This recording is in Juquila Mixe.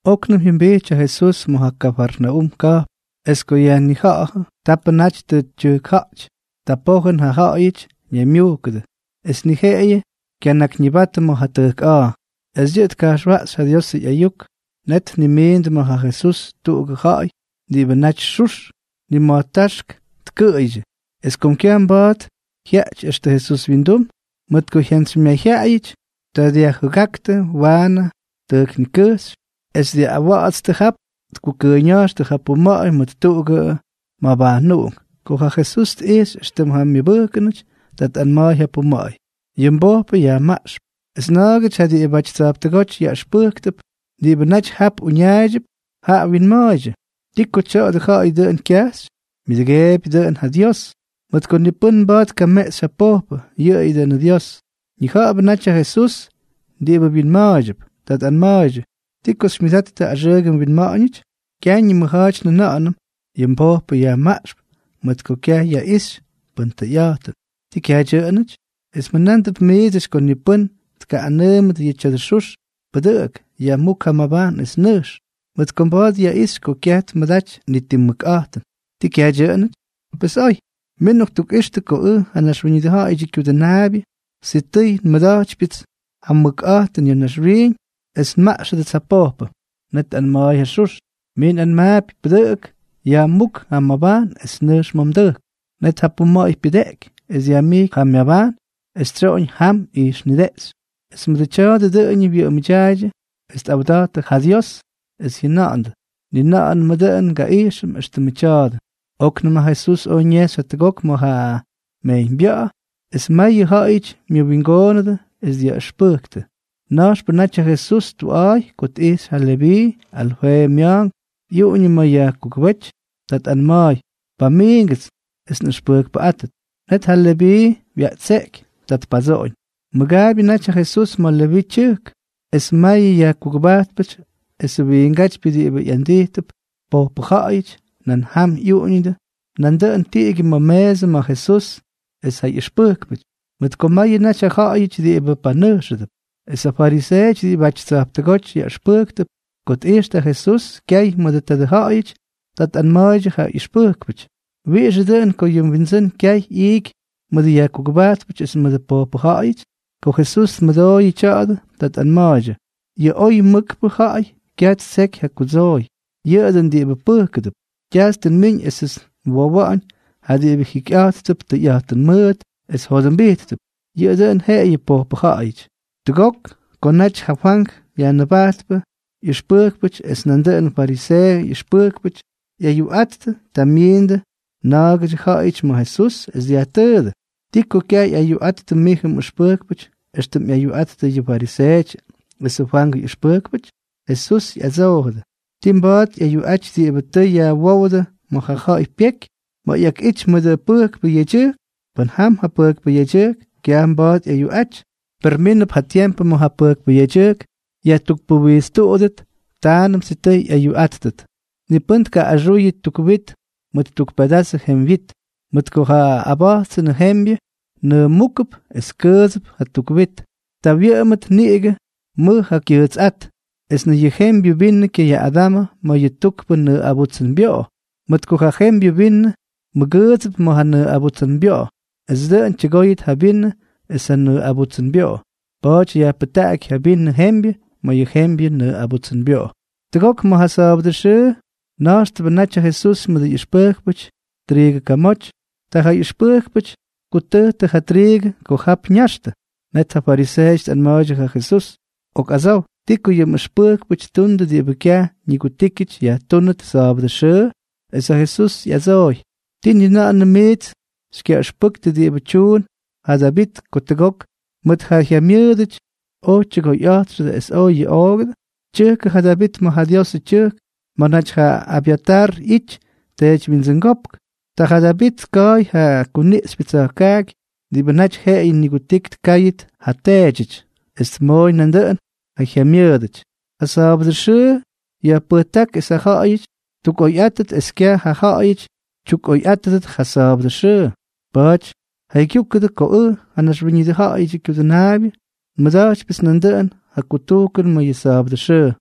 Oknʉm jyʉmbijty ja Jesús ma̱ ja Kafarnaúm ka̱jpn. Es ko yajnija̱ꞌa̱jʉ ko tapʉ naty tʉ tyʉjkja̱ꞌty, ta pojʉn ja ja̱ꞌa̱yʉty ñaymyujkʉdʉ, es ni jeꞌeyʉ kyanakyñibatʉ ma̱ ja tʉjk a̱a̱. Es yʉꞌʉ tka̱jxwaꞌxy ja Diosʉ ꞌyayuk. Net tmʉmiindʉ ma̱ ja Jesús tuꞌugʉ ja̱ꞌa̱y diꞌibʉ naty xux, nima̱jtáxk tkʉꞌʉydyʉ. Es kom kyaj mba̱a̱t jyaꞌty extʉ Jesús wyindum, mʉt ko jyantsymyayjyaꞌayʉty, ta dyajjʉgáktʉ waanʉ ja tʉjkniꞌx. Es ma̱ dyaꞌꞌawatstʉ, jap tkutʉʉyña̱jxtʉ ja puma̱ꞌa̱y mʉt tuꞌugʉ mabajnuꞌunk. Ko ja Jesús tꞌijxy éxtʉm ja myʉbʉjkʉnʉty, ta tꞌanma̱a̱y ja puma̱ꞌa̱y: —Yʉ mbojpʉ yajmaꞌxp. Es na̱a̱gʉty ja diꞌibʉty tsa̱jptʉgóty yaꞌʉxpʉjktʉp diꞌibʉ naty jap uñaaydyʉp, jaꞌa winma̱a̱ydyʉ: “¿Ti ko tya̱dʉ ja̱ꞌa̱y dʉꞌʉn kyajxy? Myʉdʉgeebyʉ dʉꞌʉn ja Dios, mʉt ko ni pʉ́n mba̱a̱t tkameꞌxy ja pojpʉ, yʉꞌʉyʉ dʉꞌʉnʉ Dios.” Ñija̱ꞌa̱bʉ naty ja Jesús diꞌibʉ wyinma̱a̱ydyʉp. Ta tꞌanma̱a̱ydyʉ: —¿Ti ko xymyʉdattʉ axʉʉgʉ winma̱ꞌa̱ñʉty? Kyaj ñimʉja̱a̱ty njʉna̱ꞌa̱nʉm: “Yʉ mbojpʉ yajmaꞌxp”, mʉt ko kyaj yaꞌixy pʉn tʉyꞌa̱jtʉn. ¿Tii kyaj dyʉꞌʉnʉty? Es mjʉna̱ꞌa̱ndʉp miidsʉty ko ni pʉ́n tkaꞌꞌanʉʉmʉt yʉ tya̱dʉ xux: “Pʉdʉꞌʉk, yajmúk ja mmabajn es nʉjx”, mʉt ko mba̱a̱t yaꞌixy ko kyaj tmʉdaty ni ti mʉkꞌa̱jtʉn. ¿Tii kyaj dyʉꞌʉnʉty? Pes oy. Min nꞌoktukꞌixtʉ ko ʉj, ja Naxwíñʉdʉ Ja̱ꞌa̱yʉdyʉ Kyudʉnaabyʉ, sitʉy nmʉda̱jtypyʉts ja mʉkꞌa̱jtʉn ya̱ naxwiiñ es nmaꞌxʉdʉts ja pojpʉ. Net tꞌanma̱a̱y ja xux: —Mij nꞌanmaapy, pʉdʉꞌʉk, yajmúk ja mmabajn es nʉjx ma̱ mdʉjk. Net ja puma̱ꞌa̱y pyʉdeꞌky, es dyajmijky ja myabajn, es tsyoꞌoñ jam ijxnideꞌxy. Es mʉdʉ tya̱a̱dʉ dʉꞌʉñʉ wyʉꞌʉmʉdyaaydyʉ es tꞌawda̱jttʉ ja Dios, es jyʉnandʉ: —Ni na̱ꞌa̱nʉmʉ dʉꞌʉn ngaꞌijxʉm éxtʉmʉ tya̱a̱dʉ. Oknʉm ja Jesús oj ñejxy jatʉgok ma̱ ja mejyñbya̱ꞌa̱, es mayʉ ja̱ꞌa̱yʉty myʉwingoonʉdʉ, es dyaꞌʉxpʉjktʉ. Na̱jxpʉ naty ja Jesús tuꞌa̱a̱y ko tꞌijxy ja Leví, Alfeeʉ mya̱a̱nk, ꞌyuꞌuñʉ ma̱ yajkugʉbéty. Ta tꞌanma̱a̱y: —Pamiingʉts es nꞌʉxpʉjkpʉꞌátʉt. Net ja Leví wyaꞌtseꞌky. Ta tpadsoꞌoñ. Mʉgaabyʉ naty ja Jesús ma̱ Leví tyʉjk, es mayʉ yajkugʉbajtpʉty esʉ wiingátypyʉ diꞌibʉ ꞌyandijtʉp pojpʉ ja̱ꞌa̱yʉty, nan jam ꞌyuꞌuñʉdʉ nandʉꞌʉn tiꞌigyʉ ma̱ meesʉ ma̱ Jesús es ja ꞌyʉxpʉjkpʉty, mʉt ko mayʉ naty ja ja̱ꞌa̱yʉty diꞌibʉ panʉjxʉdʉp. Es ja fariseeʉty diꞌibʉty tsa̱jptʉgóty yaꞌʉxpʉjktʉp, ko tꞌijxtʉ ja Jesús kyay mʉdʉ tadʉ ja̱ꞌa̱yʉty, ta tꞌanma̱a̱ydyʉ ja ʉxpʉjkpʉty: —¿Wiꞌixʉ dʉꞌʉn ko yʉ mwindsʉ́n kyay ꞌyiiky mʉdʉ yajkugʉbajtpʉty es mʉdʉ pojpʉ ja̱ꞌa̱yʉty? Ko Jesús tmʉdooyʉ tya̱a̱dʉ, ta tꞌanma̱a̱ydyʉ: —Yʉ oy mʉkpʉ ja̱ꞌa̱y kyaj ttseky ja kudsooy, yʉꞌʉ dʉꞌʉn diꞌibʉ pʉjkʉdʉp. Kyajts tʉ nmiñ esʉts nwowa̱ꞌa̱ñ ja diꞌibʉ jikyꞌa̱jttʉp tʉyꞌa̱jtʉn mʉʉt es jyodʉmbíttʉt, yʉꞌʉ dʉn jeꞌeyʉ pojpʉ ja̱ꞌa̱yʉty. Tʉgok ko naty ja Fwank Yajnʉbajtpʉ ꞌyʉxpʉjkpʉty es nandʉꞌʉnʉ fariseeʉdyʉ ꞌyʉxpʉjkpʉty ꞌyayuꞌattʉ, ta myiindʉ na̱a̱gʉdyʉ ja̱ꞌa̱yʉty ma̱ Jesús, es dyajtʉʉdʉ: —¿Ti ko kyaj ꞌyayuꞌattʉ mijʉ mꞌʉxpʉjkpʉty éxtʉm ꞌyayuꞌattʉ yʉ fariseeʉty esʉ Fwangʉ ꞌyʉxpʉjkpʉty? Jesús ꞌyadsoojʉdʉ: —¿Tii mba̱a̱t ꞌyayuꞌaty diꞌibʉ tʉ yajwówdʉ ma̱ ja ja̱ꞌa̱y pyeky, ma̱ ꞌyakꞌity mʉdʉ pʉjkpʉ yedyʉjk? Pʉn jam ja pʉjkpʉ yedyʉjk, kyaj mba̱a̱t ꞌyayuꞌaty. Per mínʉp ja tiempʉ ma̱ ja pʉjkpʉ yedyʉjk yajtukpuwijtstuꞌudʉt, taanʉm sitʉy ꞌyayuꞌáttʉt. ’Ni pʉ́n tkaꞌꞌaxuyʉ tuk wit mʉt tuk pedazʉ jemywyit, mʉt ko ja aba̱jtsʉnʉ jembyʉ nʉʉmúkʉp es kyʉʉdsʉp ja tuk wit. Ta wyʉꞌʉmʉt niꞌigʉ mʉj ja kyʉʉtsyꞌát. Es ni yʉ jembyʉ vinʉ kyayaꞌꞌadamʉ ma̱ yʉ tukpʉ nʉʉꞌabutsʉnbyoꞌo, mʉt ko ja jembyʉ vinʉ mʉgʉʉdsʉp ma̱ ja nʉʉꞌabutsʉnbyoꞌo, es dʉꞌʉn tyʉgóyʉt ja vinʉ es ja nʉʉꞌabutsʉnbyoꞌo. Pa̱a̱ty yajpʉjtaꞌaky yʉ vinʉ jembyʉ ma̱ yʉ jembyʉ nʉʉꞌabutsʉnbyoꞌo. Tʉgok ma̱ ja sa̱a̱bʉdʉ xʉʉ na̱jxtʉbʉ naty ja Jesús mʉdʉ ꞌyʉxpʉjkpʉty triigʉ kamoty, ta ja ꞌyʉxpʉjkpʉty tkutʉjtʉ ja triigʉ ko jap ñaxtʉ. Net ja fariseeʉty tꞌanma̱a̱ydyʉ ja Jesús: —Ok adsow, ¿ti ko yʉ mꞌʉxpʉjkpʉty ttundʉ diꞌibʉ kyaj ñigutíkyʉty yajtúnʉt sa̱a̱bʉdʉ xʉʉ? Es ja Jesús ꞌyadsooy: —¿Tii ni na̱ꞌa̱nʉm miits xykyaꞌʉxpʉktʉ diꞌibʉ tyuun ja Davit ko tʉgok mʉt ja jyamyʉʉdʉty oj tyʉgoyꞌa̱jtxʉdʉ es oj yuꞌoogʉdʉ? Tyʉkʉ ja Davit ma̱ ja Diosʉ tyʉjk ma̱ naty ja Abyatar ꞌyity teedywyindsʉngópk. Ta ja Davit tka̱a̱y ja kuniꞌxypyʉ tsa̱jkaaky, diꞌibʉ naty jeꞌeyʉ nigutiky tkáydyʉt ja teedyʉty, es tmooy nandʉꞌʉn ja jyamyʉʉdʉty. ’Ja sa̱a̱bʉdʉ xʉʉ yajpʉjtáky es ja ja̱ꞌa̱yʉty ttukꞌoyꞌáttʉt, es kyaj ja ja̱ꞌa̱yʉty tyukꞌoyꞌátʉdʉt ja sa̱a̱bʉdʉ xʉʉ. Pa̱a̱ty jaygyúkʉdʉ ko ʉj, ja Naxwíñʉdʉ Ja̱ꞌa̱yʉdyʉ Kyudʉnaabyʉ, nmʉda̱jtypyʉts nandʉꞌʉn ja kutujkʉn ma̱ yʉ sa̱a̱bʉdʉ xʉʉ.